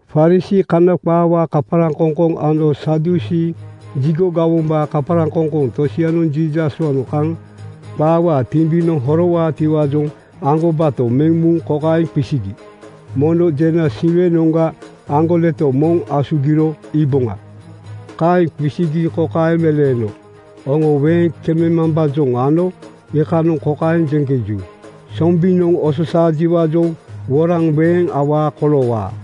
Farisii (Kana qaawaa kaparaŋkoŋkoŋ) ano Sadusii (Jigo gawombaa kaparaŋkoŋkoŋ) tosianoŋ Jiisaswaanoŋ kaŋ qaawaa timbinoŋ horowaatiwaajoŋ aŋgobato meŋ muŋ kokaeŋ qisigi, “Mono jena Siwenoŋga aŋgoleto moŋ asugiro iiboŋa.” Kaeŋ qisigi kokaeŋ meleeno, “Oŋo weeŋ kememambaajoŋ ano iikanoŋ kokaeŋ jeŋkeju, ‘Sombinoŋ ososaajiwaajoŋ woraŋ weeŋ awaa koloowaa.’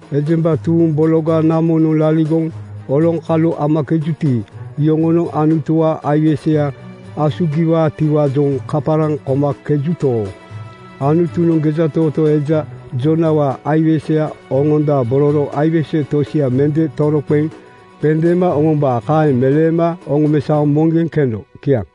Ejemba tuuŋ bologa namonoŋ laligoŋ oloŋkalu amakejuti, iyoŋonoŋ Anutuwaa aiweseya asugiwaatiwaajoŋ kaparaŋ komakejuto, Anutunoŋ gejatootoo eja Joonawaa aiweseya oŋondabororo aiwese tosia mende toroqeŋ qendeema oŋombaa.” Kaeŋ meleema oŋomesaoŋ moŋgeŋ keno. Kiaŋ.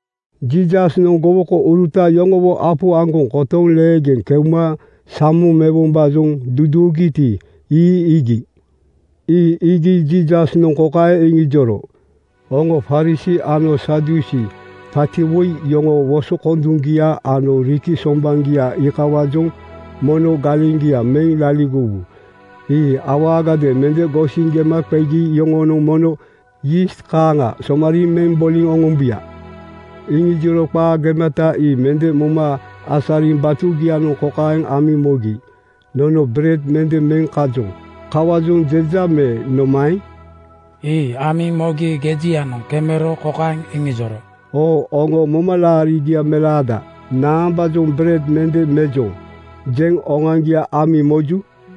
Jiisasnoŋ gowokouruta yoŋowo apu aŋgoŋ kotoŋ leegeŋ keuma samoŋ mewombaajoŋ duduugiti, ii iigi. Ii iigi Jiisasnoŋ kokaeŋ iŋijoro, “Oŋo Farisii ano Sadusii paati woi yoŋoo wosokonduŋgia ano riki sombaŋgia iikawaajoŋ mono galeŋgia meŋ laligowu. Ii awaagadeeŋ mende gosiŋ gema qegi yoŋonoŋ mono yiist kaaŋa somariiŋ meŋ boliŋ oŋombuya.” Iŋijoro qaa gemata ii mende moma asariŋ batugianoŋ kokaeŋ amiŋ mogi, “Nono bered mende meŋ kajoŋ. Kawaajoŋ jeja me nomaeŋ?” Ii amiŋ mogi gejianoŋ kemero kokaeŋ iŋijoro, “Oo oŋo momalaarigia melaada, naambaajoŋ ‘Bered mende mejoŋ,’ jeŋ oŋoaŋgia amiŋ moju?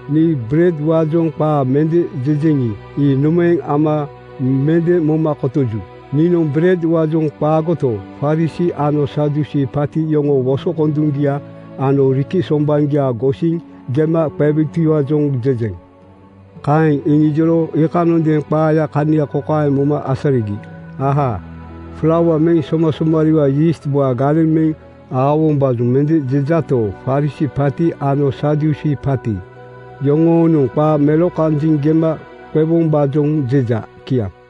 Nii beredwaajoŋ qaa mende jejeŋi, ii nomaeŋ ama mende moma kotoju? Niinoŋ beredwaajoŋ qaagoto, Farisii ano Sadusii paati yoŋoo wosokonduŋgia ano riki sombaŋgia gosiŋ gema qewutiwaajoŋ jejeŋ.” Kaeŋ iŋijoro iikanondeeŋ qaayaa kania kokaeŋ moma asarigi, “Ahaa! Flaua meŋ somasomarii yiistwaa galeŋ meŋ aowombaajoŋ mende jejato, Farisii paati ano Sadusii paati yoŋoonoŋ qaa melokanjiŋ gema qewombaajoŋ jeja.” Kiaŋ.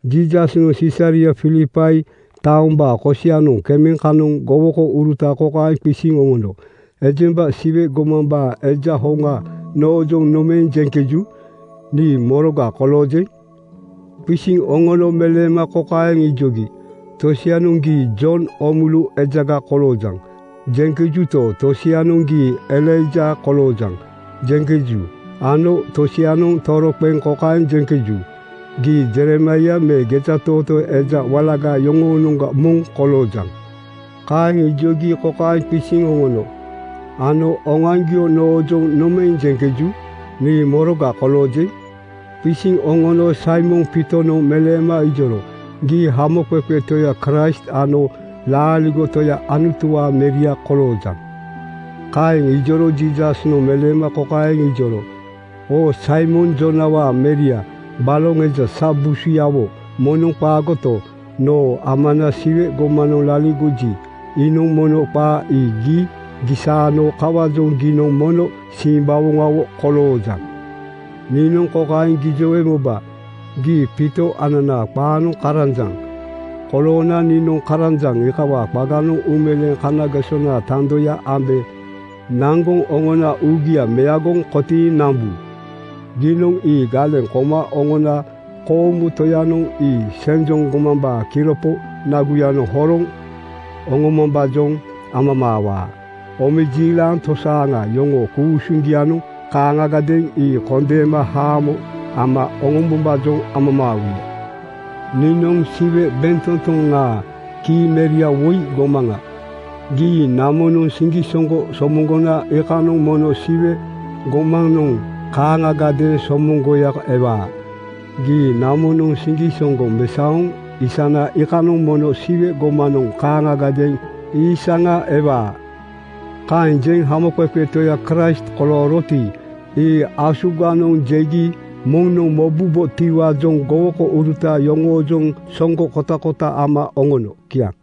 Jiisasnoŋ Sisaria Filipai taombaa kosianoŋ kema kanoŋ gowokouruta kokaeŋ qisiŋ oŋono, “Ejembanoŋ Siwe gomambaa Eja hoŋa noojoŋ nomaeŋ jeŋkeju? Nii moroga koloojeŋ?” Qisiŋ oŋono meleema kokaeŋ ijogi, “Tosianoŋ ‘Gii Jon Oomulu ejaga koloojaŋ,’ jeŋkejuto, tosianoŋ ‘Gii Elaija koloojaŋ,’ jeŋkeju ano tosianoŋ toroqeŋ kokaeŋ jeŋkeju, ‘Gii Jeremaia me gejatootoo eja walaga yoŋoonoŋga moŋ koloojaŋ.” ’ Kaeŋ ijogi kokaeŋ qisiŋ oŋono, “Ano oŋoaŋgio noojoŋ nomaeŋ jeŋkeju? Nii moroga koloojeŋ?” Qisiŋ oŋono Saimon Piitonoŋ meleema ijoro, “Gii Hamoqeqe Toya Kraist ano laaligo Toya Anutuwaa Meria koloojaŋ.” Kaeŋ ijoro Jiisasnoŋ meleema kokaeŋ ijoro, “Oo Saimon Joonawaa meria, baloŋ eja sa busuyawo moŋnoŋ qaagoto, noo Amana Siwe gomanoŋ laligoji, iinoŋ mono qaa ii gii gisaano. Kawaajoŋ giinoŋ mono simbawoŋawo koloojaŋ. Niinoŋ kokaeŋ gijowe moba: Gii Piito (ananaa qaanoŋ karanjaŋ) koloona niinoŋ karanjaŋ iikawaa qaganoŋ uumeleeŋ kanagesonaa tandoya ambe naŋgoŋ oŋona uugia meagoŋ kotiiŋ nambu. Giinoŋ ii galeŋ koma oŋona koomu Toyanoŋ ii senjoŋ gomambaa kiropo naguyanoŋ horoŋ oŋomambaajoŋ amamaawaa. Omejiilaŋ tosaaŋa yoŋoo ku-usuŋgianoŋ kaaŋagadeeŋ ii kondeema haamo ama oŋombombaajoŋ amamaawuya. “Niinoŋ Siwe bentotoŋaa kii meria woi gomaŋa. Gii namonoŋ siŋgisoŋgo somoŋgona iikanoŋ mono Siwe gomanoŋ kaaŋagadeeŋ soomoŋgoya ewaa. Gii namonoŋ siŋgisoŋgo mesaoŋ isana iikanoŋ mono Siwe gomanoŋ kaaŋagadeeŋ iisaŋa ewaa.” Kaeŋ jeŋ Hamoqeqe Toya Kraist kolooroti, ii asuganoŋ jegi moŋnoŋ mobubotiwaajoŋ gowokouruta yoŋoojoŋ soŋgo kotakota ama oŋono. Kiaŋ.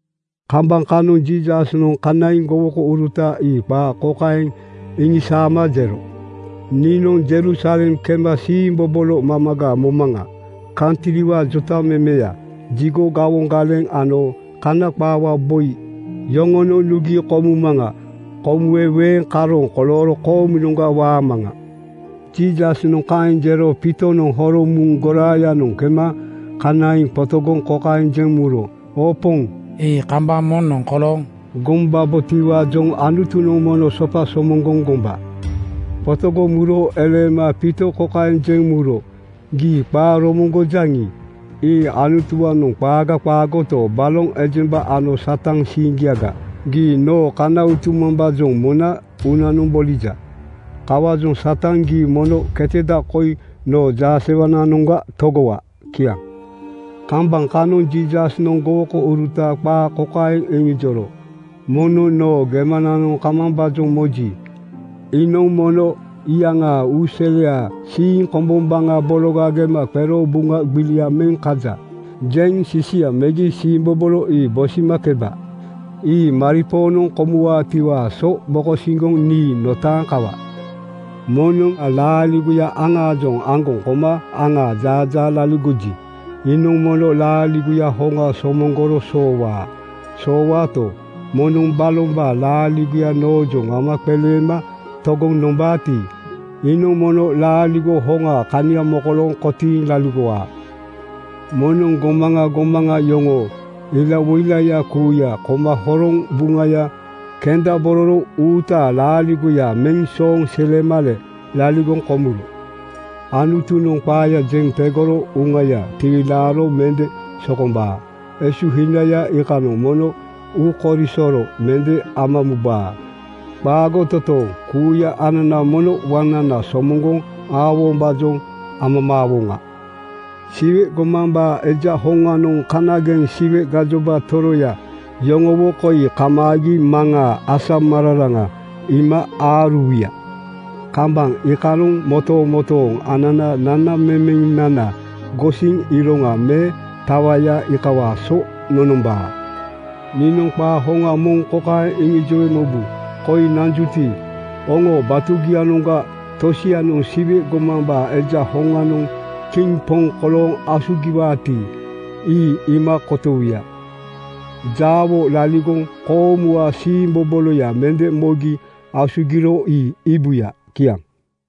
Kambaŋ kanoŋa Jiisasnoŋ kanaiŋ gowokouruta ii qaa kokaeŋ iŋisaama jero, “Niinoŋ Jerusalem kema siimbobolo mamaga momaŋa. Kantriwaa jotamemeya, jigo gawoŋ galeŋ ano Kana qaawaa boi yoŋonoŋ nugi komumaŋa. Komuwe weeŋ karooŋ kolooro koomunoŋga waamaŋa.” Jiisasnoŋ kaeŋ jero Piitonoŋ horoŋ muŋ goraayanoŋ kema kanaiŋ qotogoŋ kokaeŋ jeŋ muro, “Oo Poŋ, ii kambaŋ moŋnoŋ kolooŋ gombabotiwaajoŋ Anutunoŋ mono sopa somoŋgoŋ gomba.” Qotogoŋ muro eleema Piito kokaeŋ jeŋ muro, “Gii qaa romoŋgojaŋi, ii Anutuwaanoŋ qaaga qaagoto, baloŋ ejemba ano Satan siiŋgiaga. Gii noo kana utumambaajoŋ mona uunanoŋ bolija. Kawaajoŋ Satan, gii mono keteda koi noo jaasewananoŋga togowa!” Kiaŋ. Kambaŋ kanoŋ Jiisasnoŋ gowokouruta qaa kokaeŋ iŋijoro, “Moŋnoŋ noo gemananoŋ kamambaajoŋ moji, iinoŋ mono iyaŋaa uuseliaa siiŋ kombombaŋa bologa gema qero ‘Buŋa gbilia meŋ kaja,’ jeŋ sisia megi siimbobolo ii bosimakeba. Ii maripoonoŋ komuwaatiwaa so mokosiŋgoŋ nii notaaŋ kawa. Moŋnoŋ laaligoya iyaŋaajoŋ aŋaliŋ aŋgoŋ koma aŋaa jaajaa laligoji, iinoŋ mono laaligoya hoŋa somoŋgoro soowaa. Soowaato, moŋnoŋ balombaa laaligoya noojoŋ ama qeleema togoŋ nombaati, iinoŋ mono laaligo hoŋaa kania mokolooŋ kotiiŋ laligowaa. “Moŋnoŋ gomaŋa gomaŋa yoŋoo ilawoilaya kuuya koma hororo buŋaya kendabororo uutaa laaligoya meŋ sooŋ silemale laligoŋ komuro Anutunoŋ qaaya jeŋ tegoro uŋayanoŋ tiwilaaro mende sokombaa. Esuhinaya iikanoŋ mono uukoisoro mende ama mubaa. Qaago totooŋ! Kuuya anana mono waŋnana somoŋgoŋ aowombaajoŋ amamaawoŋa. “Siwe gomambaa Eja hoŋanoŋ kanageŋ Siwe gajoba toroya yoŋowo koi kamaagi Maŋaa asamararaŋa iima aaruwuya. Kambaŋ iikanoŋ motomotooŋ ananaa nanamemenana gosiŋ iroŋa me tawaya iikawaa so nonombaa. Niinoŋ qaa hoŋa moŋ kokaeŋ iŋijowe mobu: Koi nanjuti, oŋoo batugianoŋga tosianoŋ Siwe gomambaa Eja hoŋanoŋ kiŋ poŋ kolooŋ asugiwaati, ii iima kotowuya. Jaawo laligoŋ koomuwaa siimboboloya mende mogi asugiro ii iibuya.” Kiaŋ.